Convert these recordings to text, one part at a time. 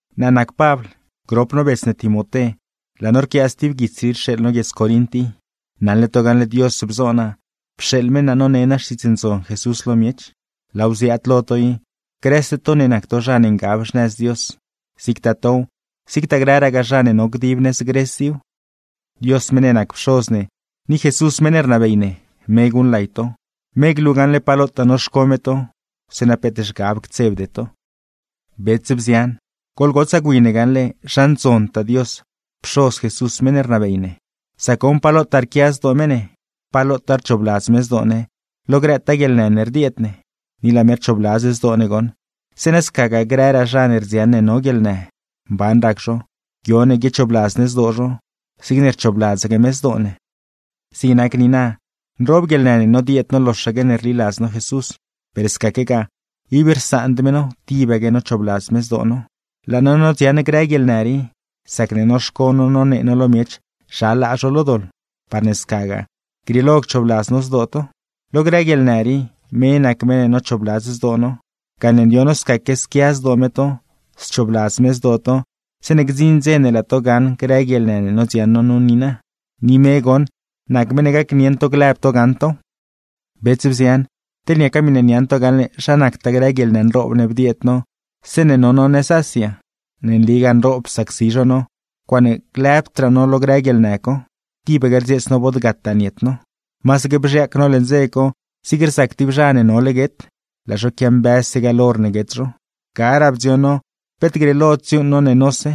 Naa nac Pabl, grop no bets ne Timoté, laa no rquia stib guits rii rxeeḻ no guiedz Corint i. Naṉle to gaṉle Dios bzo naa, pxeeḻ me naa none naa Xtiidz Ndzon Jesús lo miech. Laaw ziaad lo to i, grëse to ne nac to zha ne ngab xnëz Dios; zigtaa tow, zigtaa grëragaa zha ne no dib nëz Gres iw. Dios meṉ ne nac Pxoz ne, ni Jesús meṉ ne rnabey ne, me guṉlay to, me glu gaṉle pa lotaa noxco me to zeeṉa peet zhgab ctsebde to. Bets, bzian, goḻgotsaa gwi ne gaṉle, ¡zha ndzontaa Dios, Pxoz Jesús meṉ ne rnabey ne! Sac goṉ, pa lotaa rquia zdoo me ne, pa lotaa rchoobladz me zdoo ne lo grëtaa guieḻnë ne rdieed ne. Ni laa me rchoobladz zdoo ne goṉ, zeeṉa scagaa grëraa zha ne rdziaṉ ne no guieḻnë, mban rac zho, guio ne guiochoobladz ne zdoo zho zigne rchoobladzaque me zdoo ne. Zig nac niina, nroob guieḻnë ne nodieed no loxaque ne rliladz no Jesús, per scaquegaa ib rsaand me no tibaque nochoobladz me zdoo no. Laa no nodziaṉ grë guieḻnë rii, sacne noxco no nonee no lo miech zha laa zho lo doḻ, parne scagaa grieelo cchoobladz no zdoo to. Lo grë guieḻnë rii, me nac meṉ ne nochoobladz zdoo no, gane ndioṉ no scaque squia zdoo me to, schoobladz me zdoo to zeeṉe gdziṉ dze ne laa to gaṉ grë guieḻnë ne nodziaṉ no nu niina. Ni me goṉ nac meṉ ne gacnieṉ to glëb to gaṉ tow. Bets, bzian, teḻ niaca miṉe niaṉ to gaṉle zha nactaa grë guieḻnë nroob ne bdieed no zeeṉe no no nëz Asia. Ne nligaa nroob psacsi zho no, ncuaaṉe lëbdraa no lo grë guieḻnë co, tibaque rdzieets no bod gataa niet no. Masaque bzhiaac no leṉ dze co zig rzac tib zha ne nole guet, laa zho quiambëzse gaḻ hor ne guet zho. Garaa bdzioṉ no peet grieelod dziuuṉ no ne nose,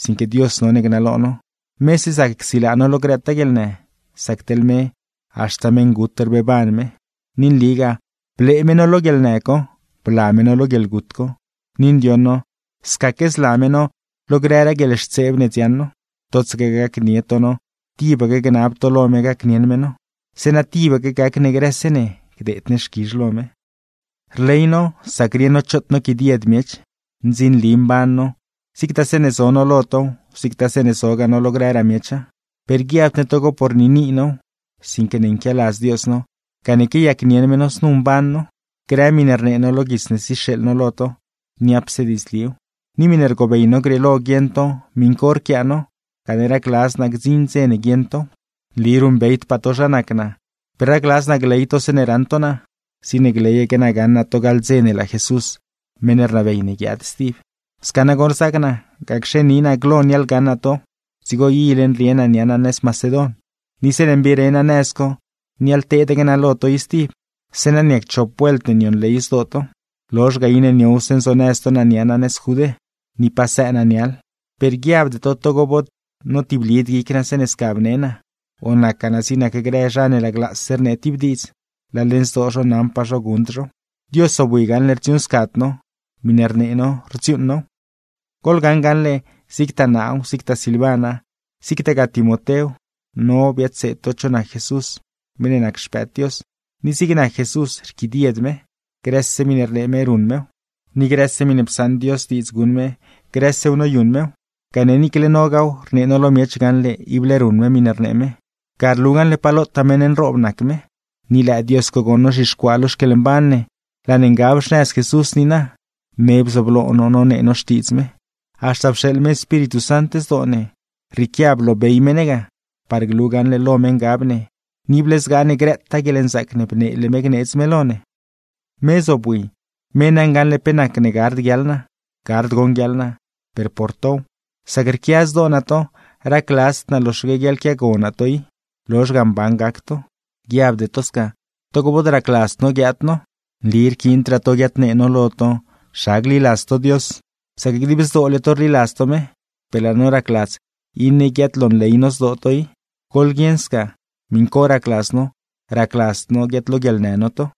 sinque Dios none gnalo no, mese zac csilaa no lo grëtaa guieḻnë; sac teḻ me, haxta meṉgut rbeeban me. Ni nligaa blee me no lo guieḻnë co, bla me no lo guieḻgut co; ni ndioṉ no scaque zla me no lo grëraa guieḻxtseeb ne dziaṉ no, totsaque gacnie to no tibaque gnab to lo me gacnieṉ me no. Zeeṉa, tibaque gac ne grëse ne gdeed ne xquizh lo me. Rley no sacne rieṉ no choot noquidied miech, ndzinli mban no, zigtaa zeeṉe zo no lo tow, zigtaa zeeṉe zogaa no lo grëraa miecha. Per guiabd ne togo por niini now, sinque ne nquialadz Dios no gane quiayacnieṉ me no znu mban no. Grë miṉe rnee no lo guits ne zixeeḻ no lo to, niapse diidzliw, ni miṉe rgobey no grieelo guieṉ to miṉ co rquiaa no; gane racladz naa gdziṉ dze ne guieṉ tow. Nli ruṉbeydpaa to zha nac naa, per racladz naa gley to zeeṉe raṉ to naa, zigne gleyaque naa gaṉ naa to gaḻ dze ne laa Jesús, meṉ ne rnabey ne guiaad stib. Sca nagoṉ rzaac naa, gacxe na ni naa glo niaḻgaṉ naa to, dzigo ile nrie naa nia naa nëz Macedon. Ni zeeṉe mbire naa nëz co, niaḻteedaque naa lo to i stib; zeeṉa niac chop vuelt ne nionley zdoo to. Lozh ga, iṉe niowse nzonëz to naa nia naa nëz Judé. Ni pasëë naa niaḻ. Per guiabde to togo bod notiblid guic naa zeeṉe sca bne naa, o nacgaa naa zig nac grë zha ne laglaase rnee tib diidz, laa leṉ zdoo zho naṉpaa zho guṉd zhow. Dios zobwi gaṉle rdziuuṉscad no. Miṉe rnee no, rdziuuṉ now. Goḻgaṉ gaṉle, zigtaa naaw, zigtaa Silvana, zigtagaa Timotéw, no biadseed to cho nac Jesús, meṉ ne nac Xpëëd Dios; ni zig nac Jesús, rquidied me. Grëse miṉe rnee me ruṉ mew, ni grëse miṉe psaṉ Dios diidz guṉ me, grësew noyuṉ mew; gane niicle nogaaw rnee no lo miech gaṉle ible ruṉ me miṉe rnee me, ga rlu gaṉle pa lotaa meṉ nroob nac me. Ni lëë Dios co goṉ nozhixcuaa lo xquieḻmban ne, laa ne ngab xnëz Jesús niina; me bzooblo no nonee no Xtiidz me. Haxta pxeeḻ me Espíritu Sant zdoo ne, rrieequia bloobey me ne ga, par glu gaṉle lo me ngab ne, ni ible zgaa ne grëtaa guieḻnzaac ne bneele me gneedz me lo ne. Me zobwi, me naṉ gaṉle pe nacne gard guiaḻ naa. Gard goṉ guiaḻ naa, per por tow; sac rquia zdoo naa to, racladzd naa loxaque guiaḻquiago naa to i, lozh ga mban gac to. Guiabde to sca togo bod racladzd no guiaad no. Nli rquiindraa to guiadnee no lo to zha gliladz to Dios, sac dib zdoole to rliladz to me; per laa no racladz iṉe guiaadlonley no zdoo to i. Goḻguieṉ sca, miṉ co racladz no, racladzd no guiaadloguieḻnë no to.